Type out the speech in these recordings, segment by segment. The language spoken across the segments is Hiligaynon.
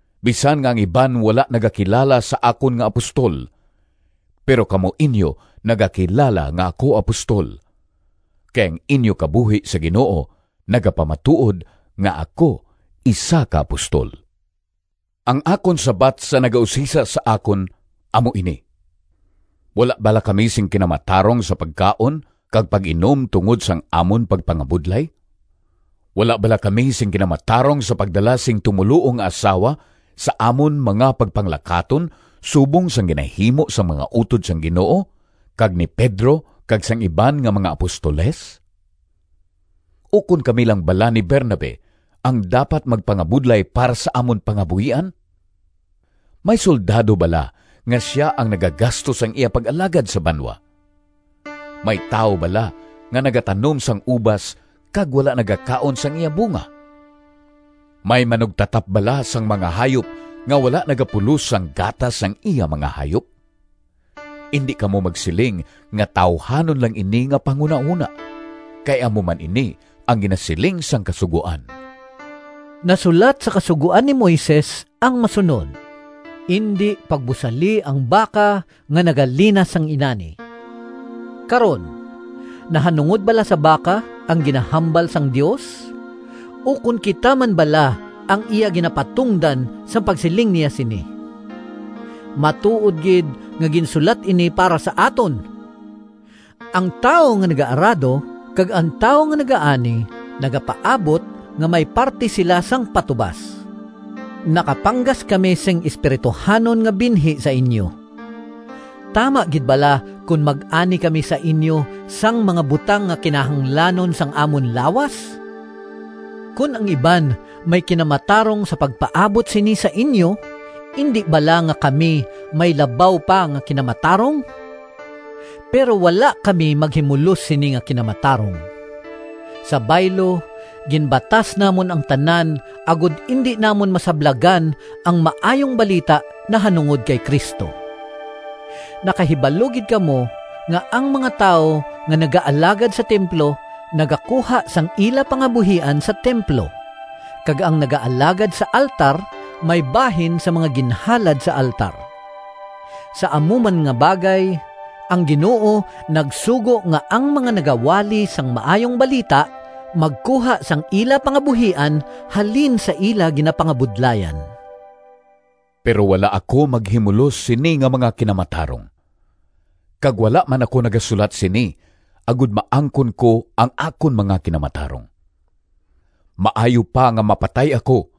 Bisan nga ang iban wala nagakilala sa akon nga apostol, pero kamo inyo nagakilala nga ako apostol, kay ang inyo kabuhi sa Ginoo nagapamatuod nga ako isa ka apostol. Ang akon sabat sa nagausisa sa akon amo ini: Wala bala kami sing kinamatarong sa pagkaon kag pag-inom tungod sang amon pagpangabudlay? Wala bala kami sing kinamatarong sa pagdala sing tumoluo nga asawa sa amon mga pagpanglakaton subong sang ginahimo sang mga utod sang Ginoo, kag ni Pedro kag sang iban nga mga apostoles? Ukon kami lang bala ni Bernabe ang dapat magpangabudlay para sa amon pangabuhian? May soldado bala nga sia ang nagagasto sang iya pag-alagad sa banwa? May tawo bala nga nagatanom sang ubas kag wala nagakaon sang iya bunga? May manugtatap bala sang mga hayop nga wala nagapulos sang gatas sang iya mga hayop? Indi kamo magsiling nga tawuhanon lang ini nga panghunahona, kay amo man ini ang ginasiling sang Kasugoan. Nasulat sa Kasugoan ni Moises ang masunod, “Indi pagbusali ang baka nga nagalinas sang inani.” Karon, nahanungod bala sa baka ang ginahambal sang Dios, ukon kita man bala ang iya ginapatungdan sang pagsiling niya sini? Matuod gid nga ginsulat ini para sa aton! Ang tawo nga nagaarado kag ang tawo nga nagaani nagapaabot nga may parti sila sang patubas. Nakapanggas kami sing espirituhanon nga binhi sa inyo. Tama gid bala kon mag-ani kami sa inyo sang mga butang nga kinahanglanon sang amon lawas? Kon ang iban may kinamatarong sa pagpaabot sini sa inyo, indi bala nga kami may labaw pa nga kinamatarong? Pero wala kami maghimulos sini nga kinamatarong. Sa baylo, ginbatas namon ang tanan, agod indi namon masablagan ang Maayong Balita nahanungod kay Cristo. Nakahibalo gid kamo nga ang mga tawo nga nagaalagad sa templo nagakuha sang ila pangabuhian sa templo, kag ang naga-alagad sa altar may bahin sang mga ginhalad sa altar. Sa amo man nga bagay, ang Ginoo nagsugo nga ang mga nagawali sang Maayong Balita magkuha sang ila pangabuhian halin sa ila ginapangabudlayan. Pero wala ako maghimulos sini nga mga kinamatarong, kag wala man ako nagasulat sini agod maangkon ko ang akon mga kinamatarong. Maayo pa nga mapatay ako,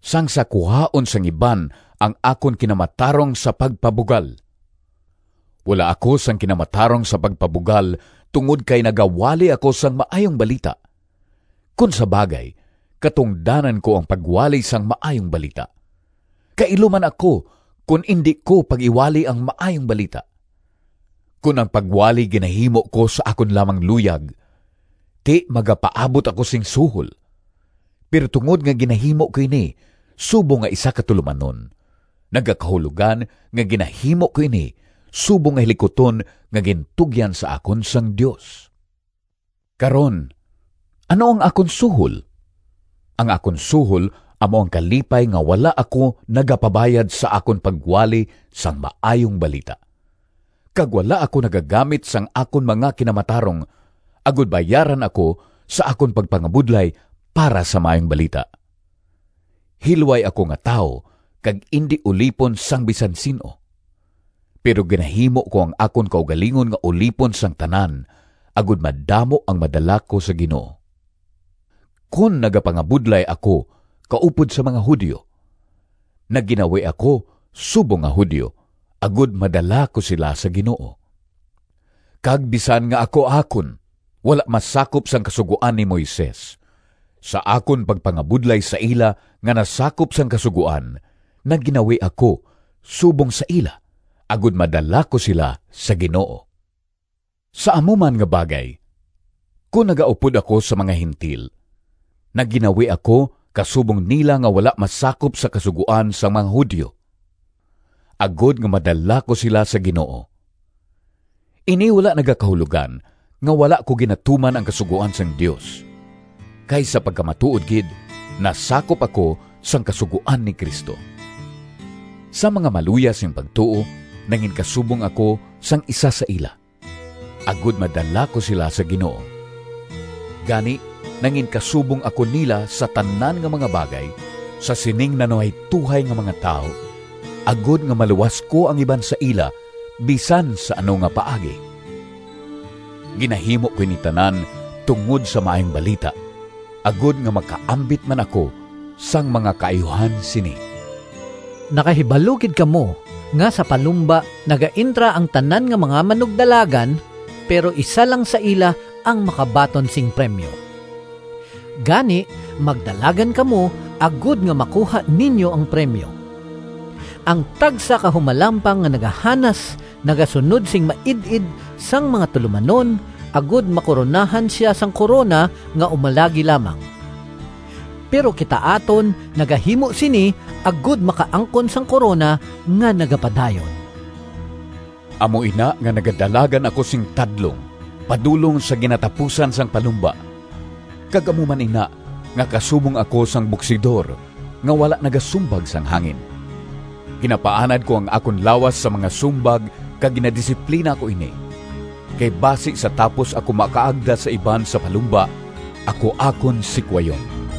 sang sa kuhaon sang iban ang akon kinamatarong sa pagpabugal! Wala ako sing kinamatarong sa pagpabugal tungod kay nagawali ako sang Maayong Balita. Kon sa bagay, katungdanan ko ang pagwali sang Maayong Balita. Kailo man ako kon indi ko pag-iwali ang Maayong Balita! Kon ang pagwali ginahimo ko sa akon lamang luyag, ti magapaabot ako sing suhol. Pero tungod nga ginahimo ko ini subong nga isa ka tulomanon, nagakahulogan nga ginahimo ko ini subong nga hilikuton nga gintugyan sa akon sang Dios. Karon, ano ang akon suhol? Ang akon suhol amo ang kalipay nga wala ako nagapabayad sa akon pagwali sang Maayong Balita, kag wala ako nagagamit sang akon mga kinamatarong, agod bayaran ako sa akon pagpangabudlay para sa Maayong Balita. Hilway ako nga tawo kag indi ulipon sang bisan sin-o. Pero ginahimo ko ang akon kaugalingon nga ulipon sang tanan, agod madamo ang madala ko sa Ginoo. Kon nagapangabudlay ako kaupod sa mga Judio, nagginawi ako subong nga Judio, agod madala ko sila sa Ginoo. Kag bisan nga ako akon wala masakop sang Kasugoan ni Moises, sa akon pagpangabudlay sa ila nga nasakop sang Kasugoan nagginawi ako subong sa ila, agod madala ko sila sa Ginoo. Sa amo man nga bagay, kon nagaupod ako sa mga Gentil, nagginawi ako kasubong nila nga wala masakop sa Kasugoan sang mga Judio, agod madala ko sila sa Ginoo. Ini wala nagakahulogan nga wala ko ginatuman ang kasugoan sang Dios, kay sa pagkamatuod gid, nasakop ako sang kasugoan ni Cristo. Sa mga maluya sing pagtuo nanginkasubong ako sang isa sa ila, agod madala ko sila sa Ginoo. Gani, nanginkasubong ako nila sa tanan nga mga bagay sa sining nanuhaytohay nga mga tawo, agod nga maluwas ko ang iban sa ila bisan sa ano nga paagi. Ginahimo ko ini tanan tungod sa Maayong Balita, agod nga makaambit man ako sang mga kaayuhan sini. Nakahibalo gid kamo nga sa palumba, nagaentra ang tanan nga mga manugdalagan, pero isa lang sa ila ang makabaton sing premyo. Gani magdalagan kamo agod nga makuha ninyo ang premyo. Ang tagsa ka humalampang nga nagahanas nagasunod sing maid-id sang mga tulomanon, agod makoronahan sia sang korona nga umalagi lamang. Pero kita aton nagahimo sini, agod makaangkon sang korona nga nagapadayon. Amo ina nga nagadalagan ako sing tadlong padulong sa ginatapusan sang palumba, kag amo man ina nga kasubong ako sang boksidor nga wala nagasumbag sang hangin. Ginapaanad ko ang akon lawas sa mga sumbag kag ginadisiplina ko ini, kay basi sa tapos ako makaagda sa iban sa palumba ako akon sikwayon.